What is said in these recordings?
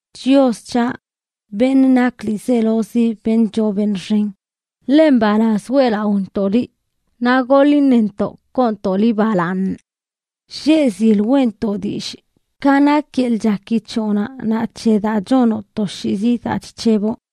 Chios c̱haꞌ, beṉꞌ nak ḻiizelozi beṉꞌ choo beṉꞌ xen, ¡ḻe mbalaz weꞌlaꞌontoꞌ liꞌ, naꞌ goḻ iṉentoꞌ koontoꞌ liꞌ balaaṉ! Lleꞌ zil weꞌntoꞌ dillꞌ ka nak yeḻꞌ chaki c̱hoꞌnaꞌ naꞌ c̱he daa chonoꞌ toshiizi daa chc̱heboꞌ.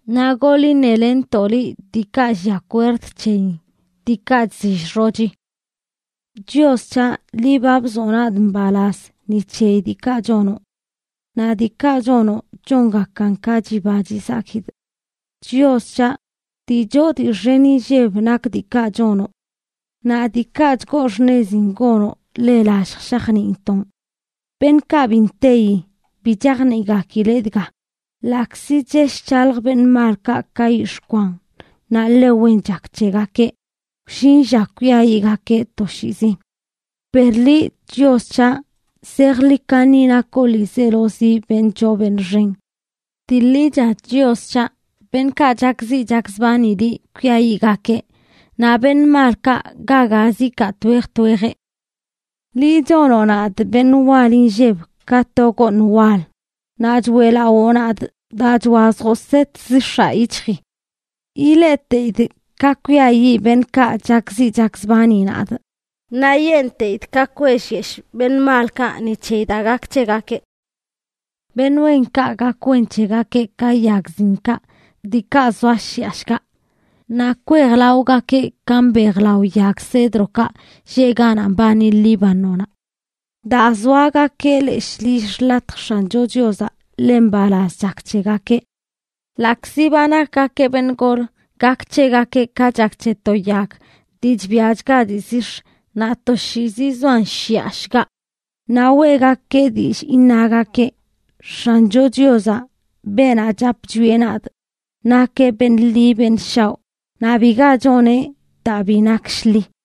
Naꞌ goḻ iṉelenntoꞌ liꞌ diikaꞌ llia kwerd c̱heyin, diikaꞌ chzill xochi. Chios c̱haꞌ, ¡Liꞌ ba bzoꞌ nadꞌ mbalaz ni c̱heyi diikaꞌ chonoꞌ! ¡Naꞌ diikaꞌ chonoꞌ chongakan ka chiba chizakidꞌ! Chios c̱haꞌ, ¡dii choo dii xen inlleb nak diikaꞌ chonoꞌ! Naꞌ ¡diikaꞌ chgoo xṉezin gonoꞌ ḻe lallj shajniintoꞌn! Beṉꞌkaꞌ bi nteyi, bi chajniꞌgakileꞌ dga: ḻaꞌkzi chesh chalj beṉꞌ malkaꞌ ka yix̱ꞌ kwan naꞌ ḻe wen chak c̱hegakeꞌ, wllin lla kwiayiꞌgakeꞌ toshiizi. Per liꞌ, Chios c̱haꞌ, zejḻi kaṉi nakoꞌ ḻiizelozi beṉꞌ choo beṉꞌ xen. Dii ḻicha, Chios c̱haꞌ, beṉꞌkaꞌ chakziꞌ chakzbani liꞌ kwiayiꞌgakeꞌ; naꞌ beṉꞌ malkaꞌ ga gazə ikaa twej twejeꞌ. Liꞌ chonoꞌ nadꞌ beṉꞌ wal inlleb ka to gooṉ wal, naꞌ choeꞌlawoꞌ nadꞌ daa chwazjoꞌ set zix̱aꞌ yic̱hjii. Ileꞌteidꞌ ka kwiayiꞌ beṉꞌkaꞌ chakziꞌ chakzbani nadꞌ; ¡naꞌ yenteidꞌ ka kwellyeshꞌ beṉꞌ malkaꞌ ni c̱heyi daa gak c̱hegakeꞌ! Beṉꞌ wenkaꞌ gak wen c̱hegakeꞌ ka yag zinkaꞌ diikaꞌ zoa shiꞌa shgaꞌ; naꞌ kwejlaogakeꞌ ka mbejlao yag cedrokaꞌ lleꞌ ganaꞌ mbani Líbanonaꞌ. Daa zoagakeꞌ leshꞌ lill xḻatj X̱ancho Chiozaꞌ, ḻe mbalaz chak c̱hegakeꞌ. Ḻaꞌkzi ba nakgakeꞌ beṉꞌ gol, gak c̱hegakeꞌ ka chak c̱he to yag dii chbiachga dii zix̱, naꞌ toshiizi zoan shiꞌa shgaꞌ. Naꞌ weꞌgakeꞌ dillꞌ iṉagakeꞌ: X̱ancho Chiozaꞌ, beenaꞌ chap chwieꞌ nadꞌ, nakeꞌ beṉꞌ ḻi beṉ shaoꞌ naꞌ biga choneꞌ daa bi nak shḻi.